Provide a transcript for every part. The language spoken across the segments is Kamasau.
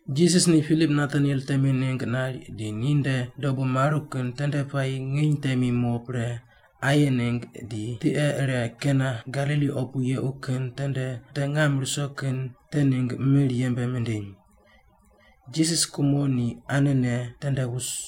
Jisas ni Pilip Nataniel temi ningg nari di ni nde dobu maru kin tende puayi nginy temi mo pre aye ningg di tiqe ire Kana Galili opu yequ kin tende wute ngam ruso kin te ningg mir yembe mindiny. Jisas kumo ni anene tende wus,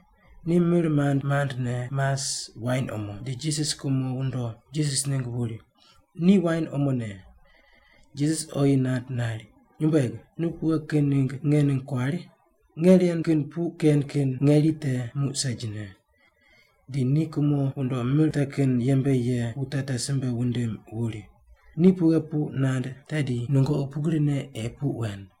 Ni mir mand mandne mas wain omo, di Jisas kumo wundo Jisas ningg wuri, “Ni wain omone.” Jisas oyi nand nari, “Nyumbueg, nu pughe kin ningg nge ningg kuari? Nge ren kin puq ken kin ngeri te muq segine.” Di ni kumo wundo mir te kin yembe ye wute te simbe wundim wuri, “Ni pughe puq nand tedi nungoqi pugrine ei puq wen.”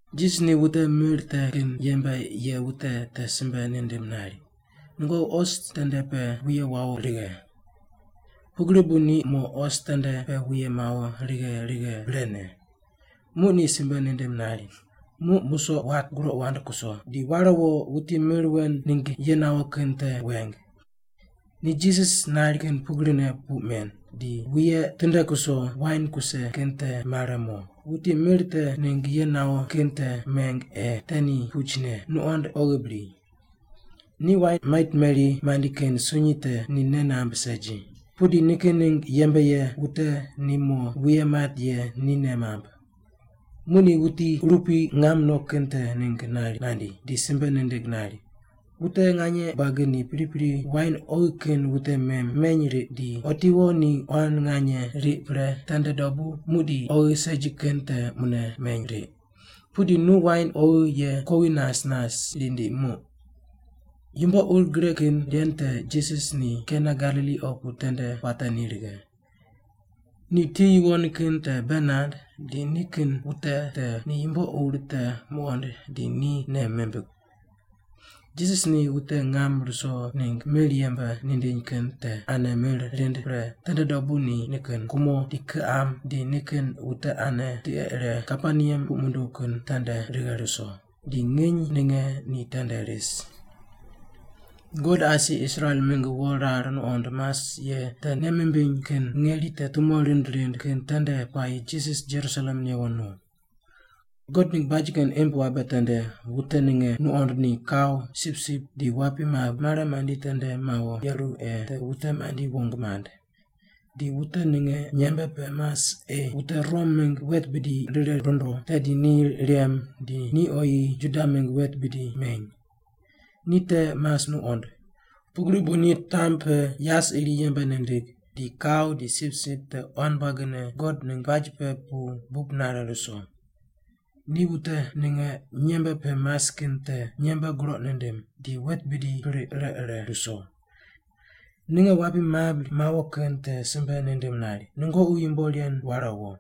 Jisas ni wute mir te kin yembe ye wute te simbe nindim nari, “Nungoqi os tende pe wuye wawo righe.” Pugri bu ni mo os tende pe wuye mawo righe righe brene. Muq ni simbe nindim nari, “Muq musoq wat, groq wand kuso, di ware wo, wuti mir wen ningg ye nawo kin te weng.” Ni Jisas nari kin pugrine puq men, di wuye tinde kuso wain kuse kin te mare mo, wuti mir te ningg ye nawo kin te meng ei te ni puch ne, nuqond, oghi bri. Ni wain mait meri mandi kin sunyi te ni nei namb segi, pudi nikin ningg yembe ye wute ni mo wuye mat ye ni nei mamb. Muq ni wuti urupui ngam no kin te ningg nari nandi, di simbe nindig nari, “Wute nganye buagi ni pripri wain oghi kin wute meny riq, di otiwo ni quan nganye riq pre tende dobu muqdi oghi segi kin te mune meny riq. Pudi nu wain oghi ye kuowi nas nas rindi muq.” Yumbo ur gre kin ren te Jisas ni Kana Galili opu tende puate ni righe. Ni ti yuwon kin te bei nand, di nikin wute ni yumbo ur te muqond di ni nei mimbig. Jisas ni wute ngam ruso ningg mir yembe mindiny kin te ane mir rind pre tende dobu ni nikin kumo, di kiqam, di nikin wute ane tiqe ire Kaperneam puq munduw kin tende righe ruso, di nginy ninge ni tende ris. God asi Israel mingg wo rar nuqond mas ye te nei mimbiny kin ngeri te tumo rind rind kin tende puayi Jisas Jerusalem newo no. God ningg baj kin imb wabe tende wute ninge nuqond ni kau, sipsip di wapi mabri mare mandi tende mawo yeru ei te wute mandi wong mand. Di wute ninge nyembe pe mas ei wute Rom mingg wet bidi rire rundo, tedi ni rem di ni oyi Juda mingg wet bidi meny. Ni te mas nuqond. Pugri bu ni tamb pe yas iri yembe nindig, di kau di sipsip te quan buagine God ningg baj pe pu bub nare ruso. Ni wute ninge nyembe pe mas kin te nyembe groq nindim, di wet bidi priq ire ire ruso. Ninge wapi mabri mawo kin te simbe nindim nari, “Nungoqi yumbo ren ware wo!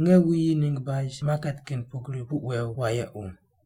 Nge wuyi ningg baj maket kin pugri puq wew wayequ!”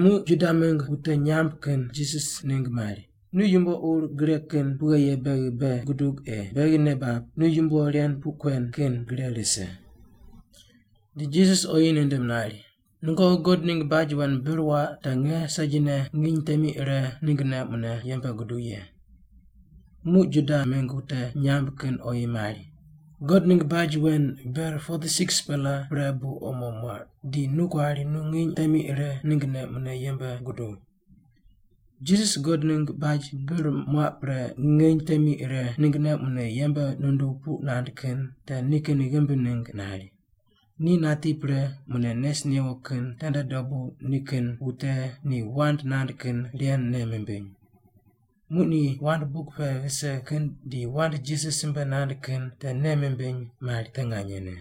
Muq Juda mingg wute nyamb kin Jisas ningg mari, “Nu yumbo ur gre kin pughe ye beghi bei gudug ei beghi nei bab nu yumbo ren puq kuen kin gre rise.” Di Jisas oyi nindim nari, “Nungoqi God ningg baj wen bir waq te nge segine nginy temi ire ninggne mune yembe guduw ye.” Muq Juda mingg wute nyamb kin oyi mari, “God ningg baj wen ber 46-pela pre bu omo muaq, di nu kuari nu nginy temi ire ninggne mune yembe guduw?” Jisas God ningg baj bir muaq pre nginy temi ire ninggne mune yembe nunduw puq nand kin te nikin ghimbi ningg nari. Ni nati pre mune nes newo kin tende dobu nikin wute ni wand nand kin ren nei mimbiny. Muq ni wand buk pe vise kin di wand Jisas simbe nand kin te nei mimbiny mari te nganyene.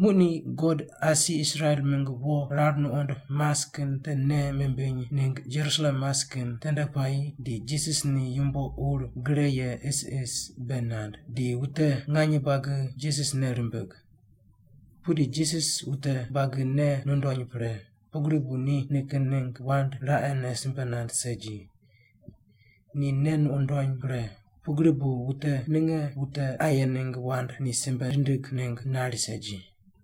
Muq ni God asi Israel mingg wo rar nuqond mas kin te nei mimbiny ningg Jerusalem mas kin tende puayi di Jisas ni yumbo ur gre ye isis bei nand, di wute nganye buagi Jisas nei rimbig. Pudi Jisas wute buagi nei nundony pre, pugri bu ni nikin ningg wand raqene simbe nand segi. Ni nei nundony pre, pugri bu wute ninge wute aye ningg wand ni simbe rindig ningg nari segi.